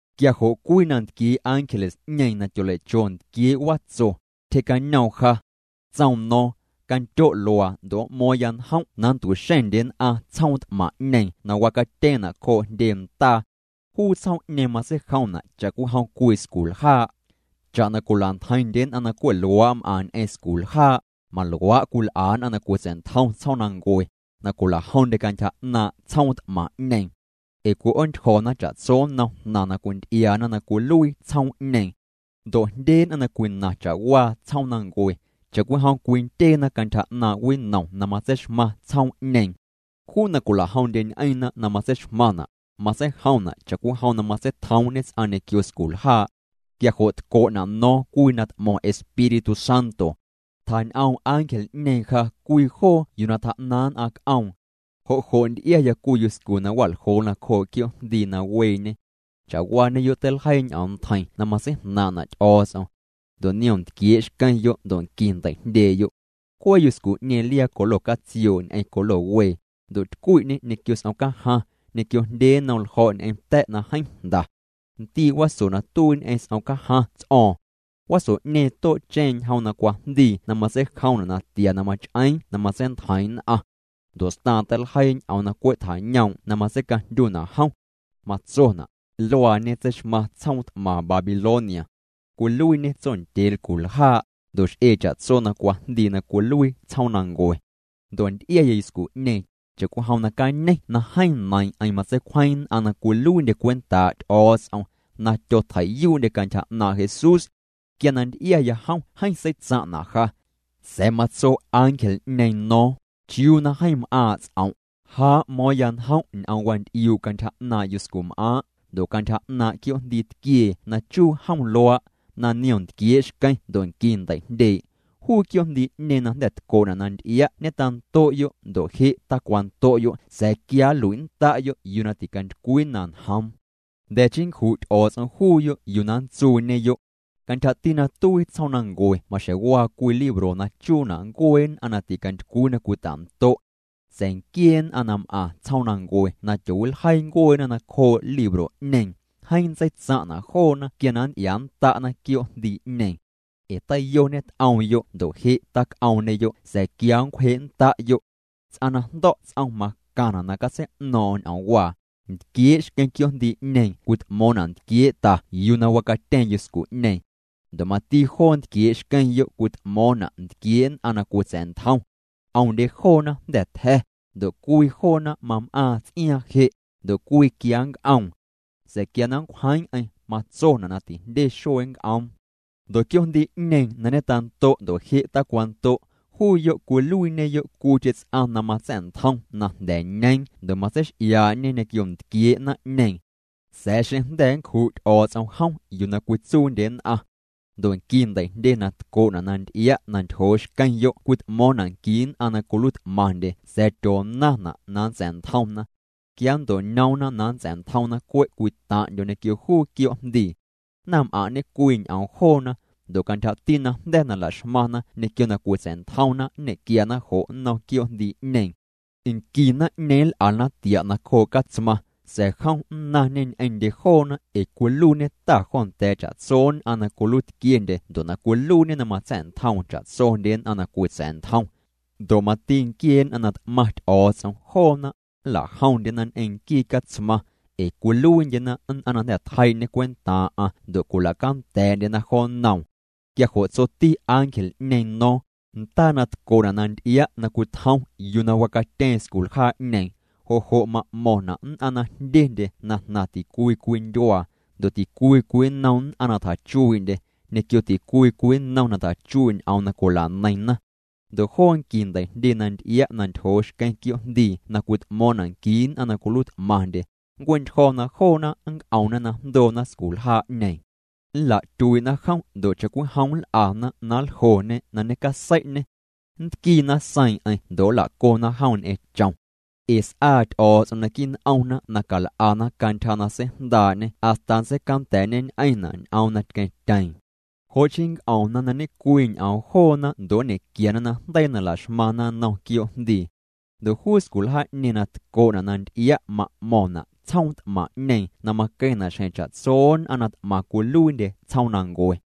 Quia jo' cwii na ntquiee' ángeles'ñeeⁿ na tyolei'cho ntquiee' watso, tyje'cañoom ja. Tsoom no̱o̱ⁿ: —Candyo' luaa ndo' m'mo̱o̱ⁿya njom' na nntu'xeⁿndye nn'aⁿ tsjoom t'maⁿ'ñeeⁿ na wacatyeeⁿna' cjoo' jndye ndaa. Juu tsjoom'ñeeⁿ matseijomna' cha'cwijom cwii sculjaa'. Cha'na cwila'ntjeiⁿndye nn'aⁿ na cwe' luaa' m'aⁿ ñ'eⁿ sculjaa', maluaa' cwil'a nn'aⁿ na cwitsa̱'ntjom tsjoomnancue, na cwilajomndye cantyja 'naaⁿ' tsjoom t'maⁿ'ñeeⁿ. Ee cwi'oontyjo̱na cha'tso nnom jnaⁿ na cwinty'iaana na cwiluii tsjoom'ñeeⁿ. Ndo' jndye nn'aⁿ na cwinaⁿ cha'waa tsjoomnancue, cha'cwijom cwindyeena cantyja 'naaⁿ' winom na matseixmaⁿ tsjoom'ñeeⁿ. Juu na cwila'jomndyeñ'eⁿna na matseixmaⁿna', matseijomna' cha'cwijom na matseitjomñe ts'aⁿ ñequio sculjaa'. Quia jo' tco'na' no̱o̱ⁿ cwii na t'mo̱ⁿ Espíritu Santo. Tjañ'oom ángel'ñeeⁿ ja cwii joo yuu na tjaa'naⁿ nn'aⁿ c'oom. Jo' jo' nty'iaya cwii yuscu na wa'ljoo nacjoo' quioo'jndii na weeñe. Cha'waañeyo' teiljeii ñ'oom ntjeiⁿ na matseijnaaⁿ'na' Ty'o̱o̱ts'om. Ndo' niom ntquiee' xqueⁿyo' ndo' nqui ndei'jndyee'yo'. Cwee yuscu'ñeeⁿ liaa colo catsioo' ñ'eⁿ colo wee, ndo' tycwi'ñê ñequio s'omcajaⁿ, ñequio jndye nnom ljo̱' ñ'eⁿ ta̱' na jeeⁿ jnda. Ndii' waso na tuii ñ'eⁿ s'omcajaⁿ ts'o̱o̱ⁿ. Waso'ñeeⁿ too'cheⁿ ñjom na cwajndii na matseijomna' natia na mach'eeⁿ na matseintjeiiⁿ nn'aⁿ. Ndo' staaⁿ teiljeii ñ'oom na cwe' tjañoom' na matseicajndyuna' jom. Matsona': “Luaañe tseixmaⁿ tsjoom t'maⁿ Babilonia. Cwiluiiñê tsondyee lculjaa', ndo' x'ee cha'tso na cwajndii na cwiluii tsjoomnancue.” Ndo' nty'iaya yuscu'ñeeⁿ, cha'cwijom na cañeⁿ na jeeⁿ neiiⁿ'eⁿ matseicwjeⁿ nn'aⁿ na cwiluiindye cwentaa' Ty'o̱o̱ts'om, na tyotjei'yuu'ndye cantyja 'naaⁿ' Jesús. Quia na nty'iaya jom jeeⁿ seitsaⁿ'na' ja. Sa̱a̱ matso ángel'ñeeⁿ no̱o̱ⁿ: —¿Chiuu na jeeⁿ m'aaⁿ' ts'om'? Ja m'mo̱o̱ⁿya njom' ñ'oom wanty'iuu' cantyja 'naaⁿ' yuscum'aaⁿ', ndo' cantyja 'naaⁿ' quioo'jndii tquiee na chuu jom luaa', na niom ntquiee' xqueⁿ ndo' nqui ndei'jndyee'. Juu quioo'jndii'ñeeⁿ na jnda̱ tco'na' na nty'ia' ñetando'yo' ndo' je' tacwando'yo' sa̱a̱ quia nlui'nnda'yo' yuu na ticantycwii na njoom. Jnda̱ chii nncju' Ty'o̱o̱ts'om juuyo' yuu na nntsuuñeyo'. Cantyjati na tuii tsjoomnancue maxjeⁿ waa cwii libro na chuuna' ncuee nn'aⁿ na ticantycwii na cwita'ndo'. Sa̱a̱ nquiee nn'aⁿ na m'aⁿ tsjoomnancue na tyoowiljeii ncueena nacjoo' libro'ñeeⁿ, jeeⁿ nntseitsaⁿ'na' joona quia na nnty'iaannda'na quioo'jndii'ñeeⁿ. Ee teiyo ñet'oomyo' ndo' je' tac'oomñeyo' sa̱a̱ quia nncwje'nnda'yo'. ’Ts'aⁿ na jndo̱' ts'om macaⁿna' na catsei'no̱o̱ⁿ'o̱ⁿ ñ'oomwaa: Ntquiee' xqueⁿ quioo'jndii'ñeeⁿ cwit'mo̱o̱ⁿna' ntquiee' ta yuu na wacatyeeⁿ yuscu'ñeeⁿ. Ndo' mati joo ntquiee' xqueⁿyo' cwit'mo̱o̱ⁿna' ntquiee' nn'aⁿ na cwitsa̱'ntjom. 'Omndye joona jnda̱ tja̱, ndo' cwii joona mam'aaⁿ ts'iaaⁿ je', ndo' cwii quia nnc'oom. Sa̱a̱ quia na nncwjeeⁿ'eⁿ matsona' na tijndye xuee nnc'oom. Ndo' quioo'jndii'ñeeⁿ na ñetando' ndo' je' tacwando', juuyo' cwiluiiñeyo' cwiicheⁿ ts'aⁿ na matsa̱'ntjom na jnda̱ ñeeⁿ ndo' matseix'iaa'ñe ñequio ntquiee' naⁿ'ñeeⁿ. Sa̱a̱ xeⁿ jnda̱ nncju' Ty'o̱o̱ts'om jom yuu na cwitsuundye nn'aⁿ. ’Ndo' nqui ndei'jndye na tco'na' na nty'ia' na ntyjoo xqueⁿyo' cwit'mo̱o̱ⁿna' nqui nn'aⁿ na cwiluiit'maⁿndye sa̱a̱ tyoonaⁿna' na nntsa̱'ntjomna. Quia nnto'ñoomna na nntsa̱'ntjomna cwe' cwii taⁿ'ndyo ñequio juu quioo'jndii. Naⁿm'aⁿ' ñe'cwii ñ'oom joona, ndo' cantyjati najnda̱ na la'xmaⁿna ñequio na cwitsa̱'ntjomna nñe'quiana jo' nnom quioo'jndii'ñeeⁿ. Nqui naⁿ'ñeeⁿ nl'ana tia' nacjoo' Catsmaⁿ, sa̱a̱ jom nnaⁿñê ñ'eⁿndye joona ee cwiluiiñê Ta jo nda̱a̱ cha'tso nn'a na cwiluiitquiendye ndo' na cwiluiiñê na matsa̱'ntjoom cha'tsondye nn'aⁿ na cwitsa̱'ntjom. Ndo' mati nquiee nn'aⁿ na t'maⁿ Ty'o̱o̱ts'om, joona nla'jomndyena ñ'eⁿ nquii Catsmaⁿ, ee cwiluiindyena nn'aⁿ na jnda̱ tjeii'ñê cwentaaⁿ'aⁿ ndo' cwila'canda̱a̱'ndyena jo nnoom. Quia jo' tsoti ángel'ñeeⁿ no̱o̱ⁿ: —Ndaa na tco'na' na nty'ia' na cwitjom yuu na wacatyeeⁿ sculjaa'ñeeⁿ, jo' jo' ma'mo̱ⁿna' nn'aⁿ na jndyendye na jnaⁿ ticwii cwii ndyuaa, ndo' ticwii cwii nnom nn'aⁿ na tjachuii'ndye, ñequio ticwii cwii nnom na tjachuii' ñ'oom na cwila'neiⁿna. Ndo' joo nqui ndei'jndye na nty'ia' na ntyjoo xqueⁿ quioo'jndii na cwit'mo̱o̱ⁿna' nqui nn'aⁿ na cwiluiit'maⁿndye, nncue'ntyjo̱ na joona nnc'omna na jndoona sculjaa'ñeeⁿ. Nla'tyuii'na jom ndo' cha'cwijom nl'ana na nljoo'ñê na ñecasei'ñê. Nntquiina seiiⁿ'eⁿ ndo' nla'cona jom ñ'eⁿ chom. Ee s'aa Ty'o̱o̱ts'om naquii' n'omna na cal'ana cantyja na seijndaa'ñê hasta nntseicanda̱a̱'ñeñ'eⁿna' ñ'oom na tqueⁿtyeeⁿ. Jo' chii nnc'omna na ñecwii ñ'oom joona ndo' nñe'quiana najndeii na la'xmaⁿna nnom quioo'jndii. Ndo' juu sculjaa'ñeeⁿ na tco'na' na nty'ia' ma'mo̱ⁿna' tsjoom t'maⁿ'ñeeⁿ na maqueⁿna' xjeⁿ cha'tso nn'aⁿ na t'maⁿ cwiluiindye tsjoomnancue.